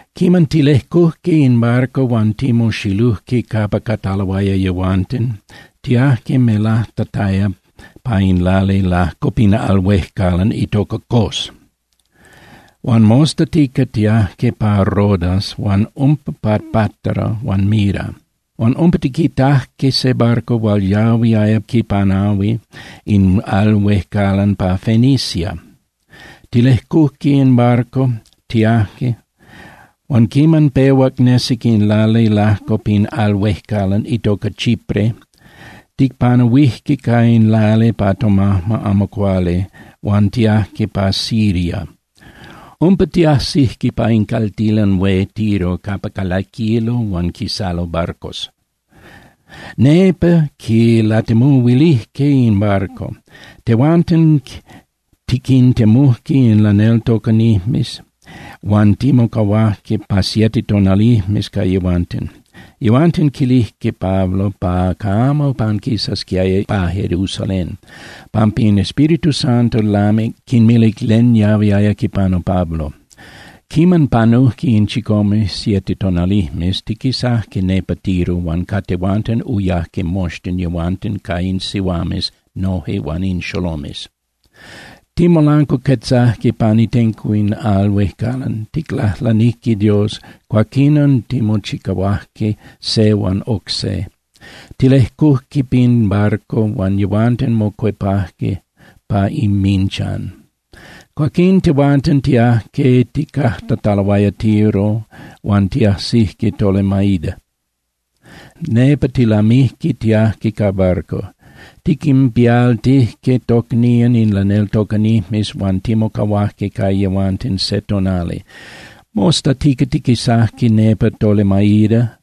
Quiman tilejcujque in barco huan timoxilujque capa cataloaya yehuanten, tiajque melajtataya pa in lali lajco pin al huejcalan itoca Cos, huan mostatica tiajque pa Rodas huan umpa pa Pátara huan Mira. Huan umpa tiquitajque se barco hual yahuiaya quipanahui in al huejcalan pa Fenicia. Tilejcujque in barco, tiajque. Huan quiman pehuac nesic in lali lajco pin al huejcalan itoca Chipre, ticpanahuijque ca in lali pa tomajma amo cuali huan tiajque pa Siria. Umpa tiajsijque pa in caltilan hué Tiro capa calaquilo huan quisalo barcos. Nepa quilatemuhuilijque in barco. Tehuanten tiquintemujque in laneltocanijmes huan timocahuajque pa siete tonalijmes ca yehuanten. Yehuanten quilijque Pablo pa camo panquisasquiaya pa Jerusalén pampa in Espíritu Santo lamic quinmilic len yahuiaya quipanu Pablo. Quiman panujque in chicome (siete) tonalijmes, tiquisajque nepa Tiro huan ca tehuanten uyajque moxtin yehuanten ca in sihuames noje huan in xolomes. Timolancuacuetzajque pan itenco in al huejcalan, ticlajlanijque Dios, cuaquinon timochicahuajque se huan oc se. Tilejcujque pin barco huan yehuanten mocuepajque pa inminchan. Cuaquín tehuanten tiajque tijcajtataloaya Tiro huan tiajsijque Tolemaida. Nepa tilamijque tiajque ca barco. Tiquinpialtijque tocnían in laneltocanijmes huan timocahuajque ca yehuanten se tonali. Mostatica tiquisajque nepa Tolemaida,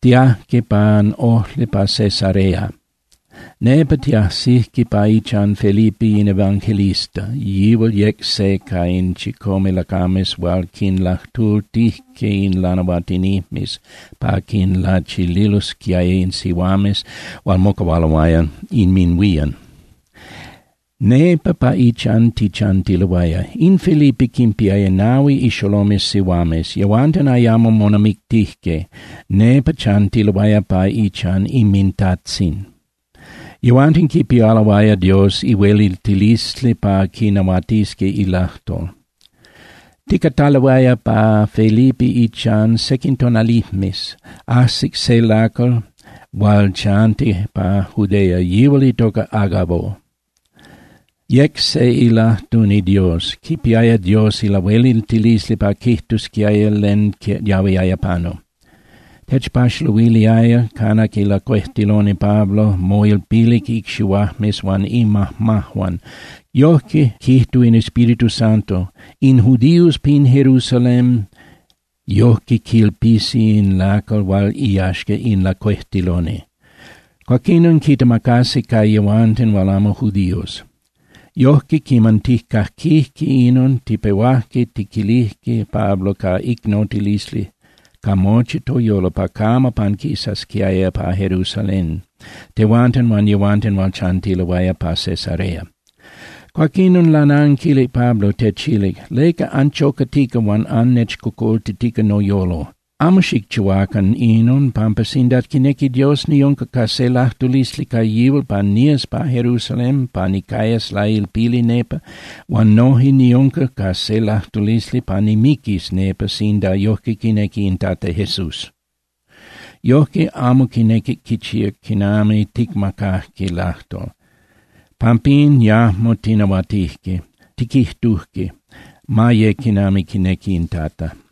tiajque pan ojli pa Cesarea, nepa tiajsijque pa ichan Felipe in evangelista, yihual yec se ca in chicome lacames hual quinlajtultijque in lanahuatinijmes pa quinlachililosquiaya in sihuames hual mocahualoaya inminhuían. Nepa pa ichan tichantiloaya. In Felipe quinpiaya nahui ixolomes sihuames. Yehuanten ayamo monamictijque, nepa chantiloaya pa ichan inmintajtzin. Yehuanten quipialoaya Dios ilahueliltilisli pa quinahuatisqui ilajtol. Ticataloaya pa Felipe ichan sequin tonalijmes, ajsic se lacal hual chantic pa Judea, yihual itoca Agabo. Yec se ilajtuni Dios, quipiaya Dios ilahueliltilisli pa quijtusquiaya len yahuiaya panu. Techpaxaluiliaya, canac ilacuejtiloni Pablo, moilpilic icxihuajmes huan imajmajuan, quijtuc: —Yojque quijtúa in Espíritu Santo: In judíos pin Jerusalén yojque quilpisi in lacal hual iyaxca in lacuejtiloni. Cuaquinon quitemacasi ca yehuanten hual amo judíos. Yojque quiman tijcaquijque inon, tipehuajque tiquilijque Pablo ca icnotilisli ca mochi toyolo pa camo panquisasquiaya pa Jerusalén, tehuanten huan yehuanten hual chantiloaya pa Cesarea. Cuaquinon lananquilic Pablo, techilic: —¿Leca anchocatica huan annechcocoltitica noyolo? Amo xicchihuacan inon pampa sinda quinequi Dios, niunca ca se lajtulisli ca yihual pa nías pa Jerusalén pa nicayas lailpili nepa, huan noje niunca ca se lajtulisli pa nimiquis nepa sinda yojque quinequi in Tata Jesús. Yojque amo quinequic quichíac quinami ticmacajque lajtol, pampín yajmo tinahuatijque, tiquijtujque: —Ma ye quinami quinequi in Tata.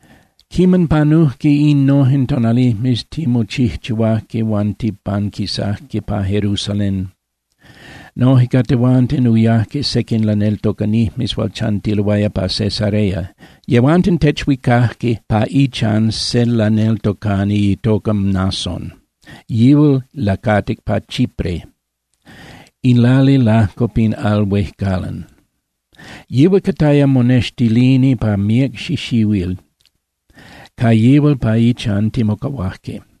Quiman panujque innojen tonalijmes, timochijchihuajque huan tipanquisajque pa Jerusalén. Noje ca tehuanten uyajque sequin laneltocanijmes hual chantiloaya pa Cesarea. Yehuanten techhuicajque pa ichan se laneltocani itoca Mnason, yihual lacatic pa Chipre, in lali lajco pin al huejcalan. Yihual cataya monextilini pa míac xixihuil, ca yihual pa ichan timocahuajque.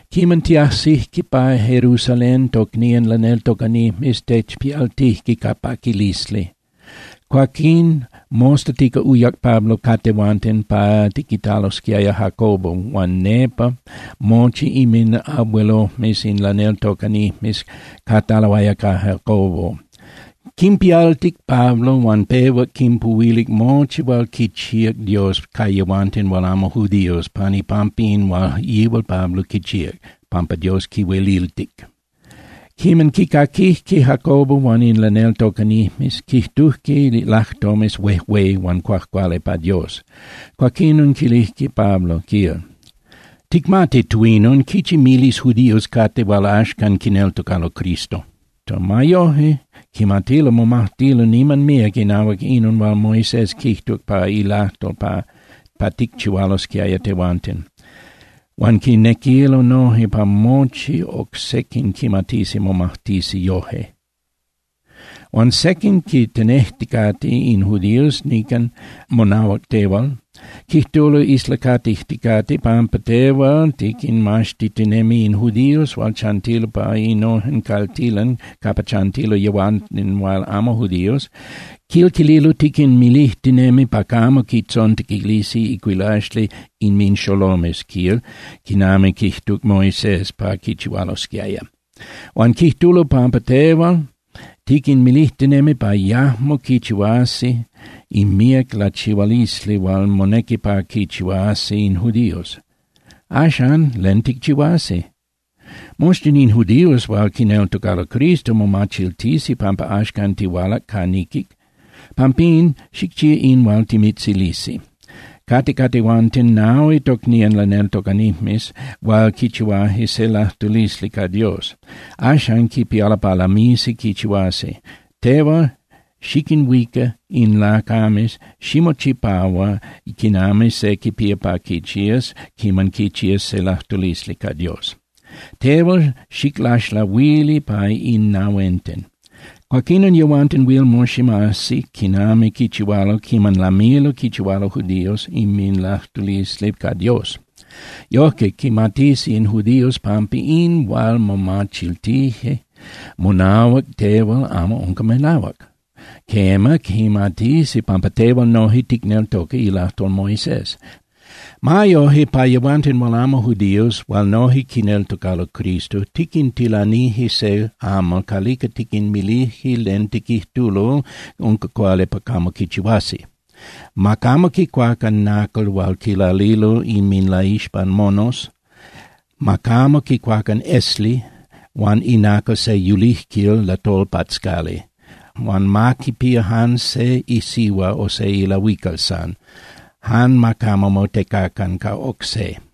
Quiman tiajsijque pa Jerusalén, tocnían laneltocanijmes techpialtijque ca paquilisli. Cuaquín mostatica uyac Pablo ca tehuanten pa tiquitalosquiaya Jacobo huan nepa mochi inminabuelojmes in laneltocanijmes cataloaya ca Jacobo. Quinpialtic Pablo huan pehuac quinpuhuilic mochi hual quichíac Dios ca yehuanten hual amo judíos pan ipampa in hual yihual Pablo quichíac, pampa Dios quihueliltic. Quiman quicaquijque Jacobo huan in laneltocanijmes, quijtujque lajtomes huejué huan cuajcuali pa Dios. Cuaquinon quilijque Pablo, quil: —Ticmati, tuinon, quichi miles judíos cate hual axcan quineltocalo Cristo. Ma yoje, quimatilo momajtilo niman míac inahuac inon hual Moisés quijtuc pa ilajtol pa ticchihualosquiaya tehuanten, huan quinequilo noje pa mochi oc sequin quimatisi momajtisi yoje. Huan sequin quintenejticate in judíos nican monahuac tehual. Quijtulo islacatijticate pampa tehual tiquinmaxtitinemi in judíos hual chantilo pa innojen caltilan capa chantilo yehuanten hual amo judíos, quil quililo, tiquinmilijtinemi pa camo quintzontequilisi icuilaxli inminxolomes, quil, quinami quijtuc Moisés pa quichihualosquiaya. Huan quijtulo pampa tehual tiquinmilijtinemi pa yajmo quichihuasi in míac lachihualisli hual monequi pa quinchihuasi in judíos. Axan, ¿len ticchihuasi? Moxtin in judíos hual quineltocalo Cristo momachiltisi pampa axcan tihualac ca niquic. Pampín, xicchía in hual timitzilisi: Cate ca tehuanten nahui tocnían laneltocanijmes hual quichihuaje se lajtulisli ca Dios. Axan quipialo pa lamisi quichihuasi. Tehual xiquinhuica in lacames, ximochipahua quinami se quipía pa quichías quiman quichías se lajtulisli ca Dios. Tehual xiclaxlahuili pa in nahuenten. Cuaquinon yehuanten huil moximasi quinami quichihualo quiman lamilo quichihualo judíos inminlajtulisli ca Dios. Yojque quimatisi in judíos pampa in hual momachiltije monahuac tehual amo unca melahuac. Quema, quimatisi pampa tehual noje ticneltoca ilajtol Moisés. Ma yoje, pa yehuanten hual amo judíos hual noje quineltocalo Cristo, tiquintilanije se amal calica tiquinmilije len tiquijtulo unca cuali pa camo quichihuasi: Ma camo quicuacan nacal hual quilalilo inminlaixpan monos, ma camo quicuacan esli huan inacal se yulijquil latolpatzcali, huan ma quipía jan se isihua o se ilahuical san. Jan ma camo motecacan ca oc se.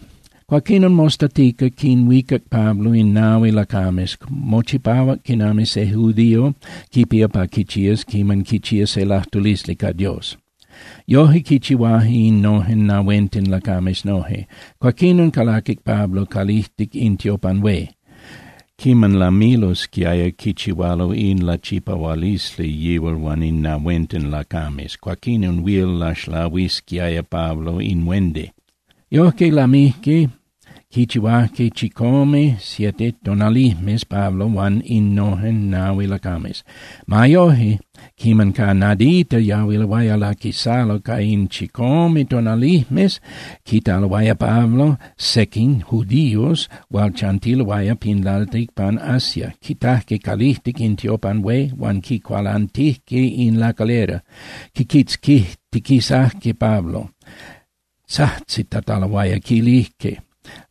Cuaquinon mostatica quinhuicac Pablo in nahui lacames, mochipahuac quinami se judío quipía pa quichías quiman quichía se lajtulisli ca Dios. Yoje quichihuaje innojen nahuenten lacames noje, cuaquinon calaquic Pablo calijtic in tiopan hué, quinlamachiltic in tiopistas quichi tonalijmes cayalosquiaya quiman lamilosquiaya quichihualo in lachipahualisli yihual huan in nahuenten lacames, cuaquinon huil laxlahuisquiaya Pablo in huendi. Yojque lamijque quichihuajque chicome (siete) tonalijmes Pablo huan innojen nahui lacames. Ma yoje, quiman ca nadita yahuiloaya laquisalo ca in chicome tonalijmes, quitaloaya Pablo sequin judíos hual chantiloaya pin lalticpan Asia, quitajque calijtic in tiopan hué huan quincualantijque in lacalera. Quiquitzquitiquisajque Pablo, tzajtzitataloaya, quilijque: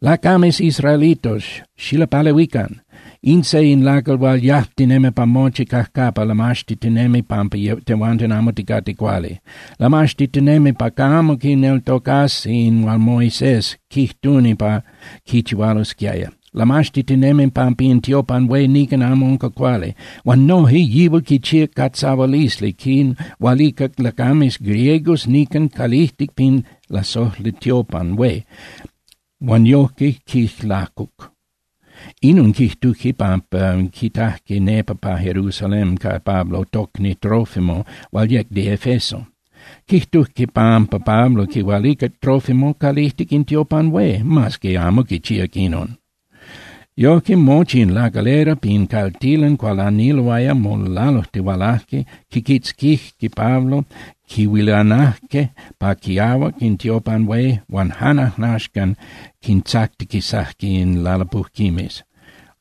—¡Lacames israelitos, xilapalehuican! ¡In se in lacal hual yajtinemi pa mochi cajcapa lamaxtitinemi pampa tehuanten amo ticate cuali! ¡Lamaxtitinemi pa camo quineltocasi in hual Moisés quijtuni pa quichihualosquiaya! ¡Lamaxtitinemi pampa in tiopan hué nican amo unca cuali! ¡Huan noje yihual quichíac catzahualisli, quinhualicac lacames griegos nican calijtic pin lasojli tiopan hué huan yojque quijlacuc! Inon quijtujque pampa quitajque nepa pa Jerusalén ca Pablo tocni Trófimo hual yec de Efeso. Quijtujque pampa Pablo quihualicac Trófimo calijtic in tiopan hué, mas que amo quichíac inon. Yojque mochi in lacalera pin caltilan cualaniloaya, molalujtihualajque, quiquitzquijque Pablo, quihuilanajque pa quiahuac in tiopan hué, huan jan ajnaxcan quintzactiquisajque in lalapujquimes.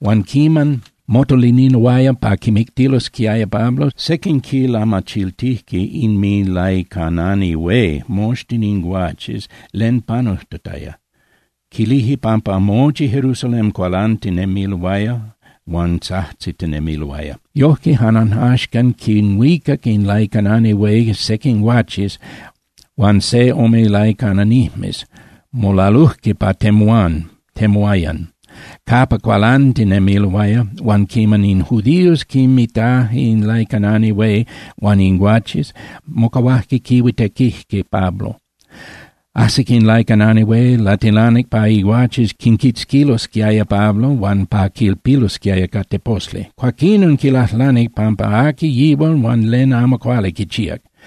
Huan quiman motoliniloaya pa quimictilosquiaya Pablo, sequin quilamachiltijque inminlaicanani hué moxtin in guaches len panujtataya, quilijque pampa mochi Jerusalén cualantinemiloaya huan tzajtzitinemiloaya. Yojque jan ajnaxcan quinhuicac in laicanani hué sequin guaches huan se ome laicananijmes, molalujque pa temuán (temuayan) capa cualantinemiloaya. Huan quiman in judíos quinmitajque in laicanani hué huan in guaches, mocahuajque quihuitequijque Pablo. Ajsic in laicanani hué, latilanic pa iguaches quiquitzquilosquiaya Pablo huan pa quilpilosquiaya ca teposli. Cuaquinon quilajlanic pampa aqui yihual huan len amo cuali quichíac.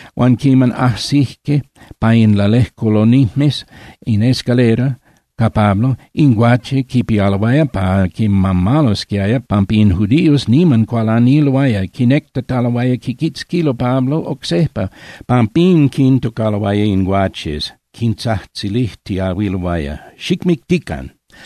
Huan quiman ajsijque pa in lalejculonijmes (in escalera) ca Pablo, in guaches quipialoaya pa quimamalosquiaya pampa in judíos niman cualaniloaya, quinectataloaya quiquitzquilo Pablo oc sejpa. Pampín quintocaloaya in guaches, quintzajtzilijtiahuiloaya: —¡Xicmictican!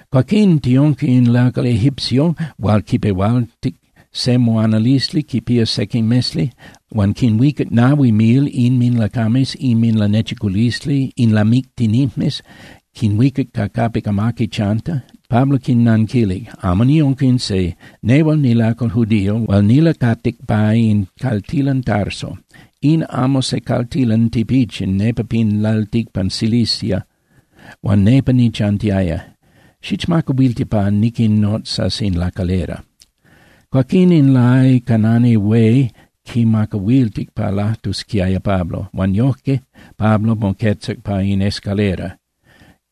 Cuaquín tiunca in lacal egipcio hual quipehualtic se moanalisli quipía sequin mesli. Huan quinhuicac nahui mil inminlacames inminlanechiculisli in lamictinijmes, quinhuicac ca capic amaqui chanti. Pablo quinanquilic: —Amo niunca in se. Nehual nilacal judío huan nilacatic pa in caltilan Tarso. In amo se caltilan tipichin nepa pin lalticpan Cilicia huan nepa nichantiaya. Xichmacahuilti pa niquinnotzas in lacalera. Cuaquín in laicanani hué quimacahuiltic pa lajtusquiaya Pablo, huan yojque Pablo moquetzac pa in escalera.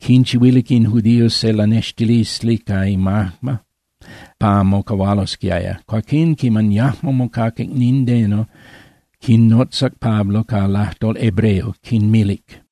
Quinchihuilic in judíos se lanextilisli ca imajma pa mocahualosquiaya. Cuaquín quiman yajmo mocaquic nindeno, quinnotzac Pablo ca lajtol hebreo, quinmilic: